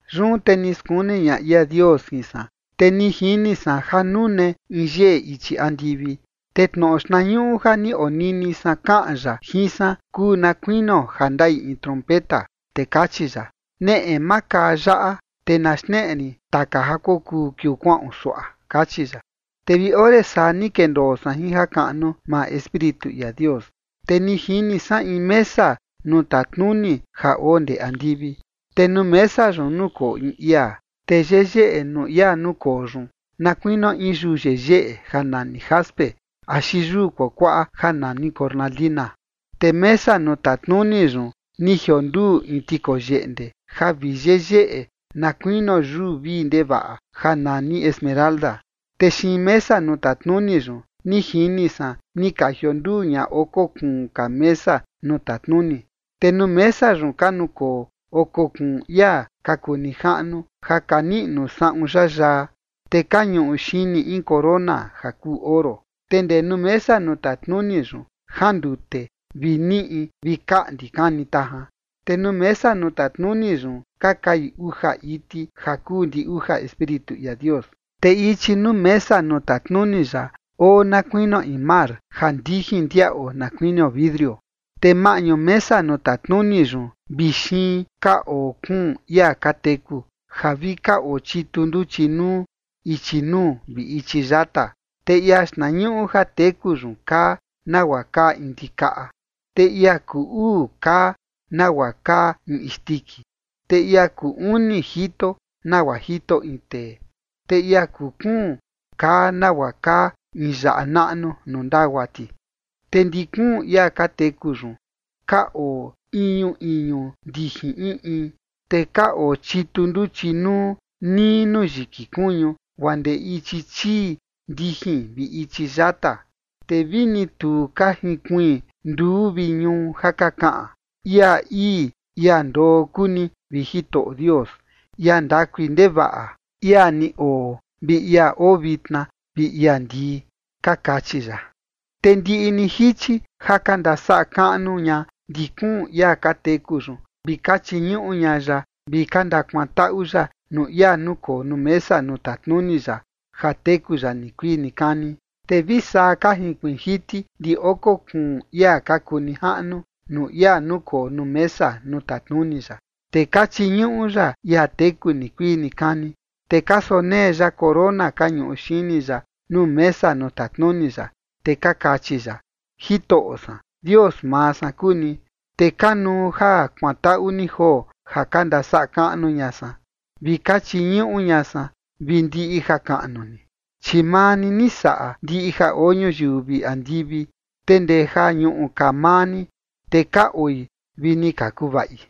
Yun te ni skuni ña ia Dios jin san, te ni jini san ja nune in yeꞌe ichi andivi, te tnoꞌo xtnañuꞌu ja ni onini san kaꞌan ya jin san kuu na kuinio ja ndaꞌi in trompeta, te kachi ya: ―Neꞌe, makaa yaꞌa, te na xneꞌe rin taka ja kokuu kiuu kuaꞌon suaꞌa ―kachi ya. Te vi ore saa ni kendoo san jin jakaꞌnu maa Espíritu ia Dios, te ni jini san in mesa nuu tatnuni ja oo ndee andivi, te nuu mesa yun nukoo in ia. Te yeyeꞌe nuu ia nukoo yun na kuinio in yuu yeyeꞌe ja nani jaspe axi yuu kuakuaꞌa ja nani cornalina. Te mesa nuu tatnuni yun ni jionduu in tikoyeꞌnde ja vi yeyeꞌe na kuinio yuu vii ndevaꞌa ja nani esmeralda. Te xiin mesa nuu tatnuni yun, ni jini san ni ka jionduu ña oko kuun ka mesa nuu tatnuni, te nuu mesa yun ka nukoo oko kuun ia ka kuu nijaꞌnu ja ka niꞌnu saꞌun yayaa, te ka ñuꞌu xini in corona ja kuu oro. Te ndee nuu mesa nuu tatnuni yun jandute vi niꞌi vi kaꞌndi kani tajan, te nuu mesa nuu tatnuni yun ka kai uja iti ja kuu ndi uja espíritu ia Dios. Te ichi nuu mesa nuu tatnuni ya, oo na kuinio in mar ja ndijin ndiaꞌo na kuinio vidrio, te maꞌñu mesa nuu tatnuni yun vi xiin ka oo kuun ia ka teku ja vi ka oo chitu nduchi nuu ichi nuu vi ichi yata. Te ia xtnañuꞌu ja teku yun kaa nagua kaa in ndikaꞌa, te ia kuu uu kaa nagua kaa in isndiki, te ia kuu uni jito nagua jito in tee, te ia kuu kuun kaa nagua kaa in yaꞌa naꞌnu nuu ndagua ti. Te ndi kuun ia ka teku yun ka oo iñu iñu ndijin in in, te ka oo chitu nduchi nuu nii nuu yiki kuñu guaa ndee ichi chii ndijin vi ichi yata, te vini tu ka jinkuiin nduu vi ñuu ja ka kaꞌan: Ia ii, ia ndoo kuu ni, vi Jitoꞌo Dios, Ia ndakui ndevaꞌa, Ia ni oo, vi ia oo vitna, vi ia ndii. Ka kachi ya. Te ndiꞌi ni jichi ja ka ndasaꞌa kaꞌnu ña ndi kuun ia ka teku yun vi ka chiñuꞌu ña ya vi ka ndakuantaꞌu ya nuu ia nukoo nuu mesa nuu tatnuni ya ja teku ya nikuii nikani. Te vi saa ka jinkuiin jiti ndi oko kuun ia ka kuu nijaꞌnu nuu ia nukoo nuu mesa nuu tatnuni ya, te ka chiñuꞌu ya ia teku nikuii nikani, te ka sonee ya corona ka ñuꞌu xini ya nuu mesa nuu tatnuni ya, te ka kachi ya: Jitoꞌo san, Dios maa san kuu ni, te kanuu ja kuantaꞌu ni joo ja ka ndasaꞌa kaꞌnu ña san, vi ka chiñuꞌu ña san vi ndiꞌi jakaꞌnu ni, chi maa ni ni saꞌa ndiꞌi ja oo ñuyiu vi andivi, te ndee ja ñuꞌu ka maa ni, te ka oi vi ni ka kuvaꞌi.